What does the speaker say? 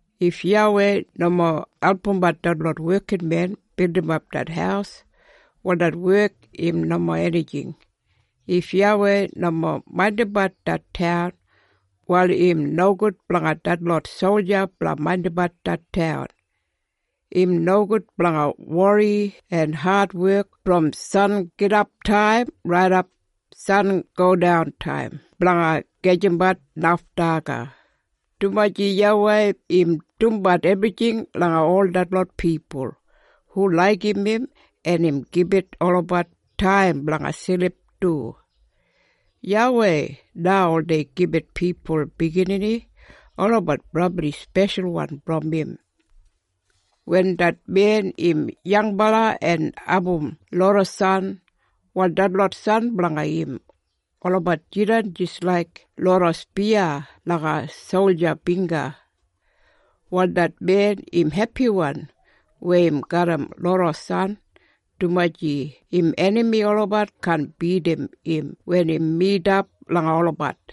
If YAWEI nomo albumbat detlot wekinmen bildimap det haus, wal det wek im nomo enijing. If YAWEI nomo maindimbat det taun, wal im nogud blanga detlot solja blanga maindimbat det taun. Im nogud blanga wori en adwek brom sangidaptaim raidap sangodantaim blanga gajimbat naf daga, dumaji YAWEI im dumbat ebrijing langa ol detlot pipul hu laigim im en im gibit olabat taim blanga silip du. YAWEI na oldei gibit pipul biginini. Olabat brabli speshalwan brom im. Wen det men im yangbala en abum loda san, wal detlot san blanga im, olabat jidan jis laik loda spiya langa solja bingga. Wal det men im hepiwan weya im garram loda san, dumaji im enami olabat kaan bidim im wen im midap langa olabat.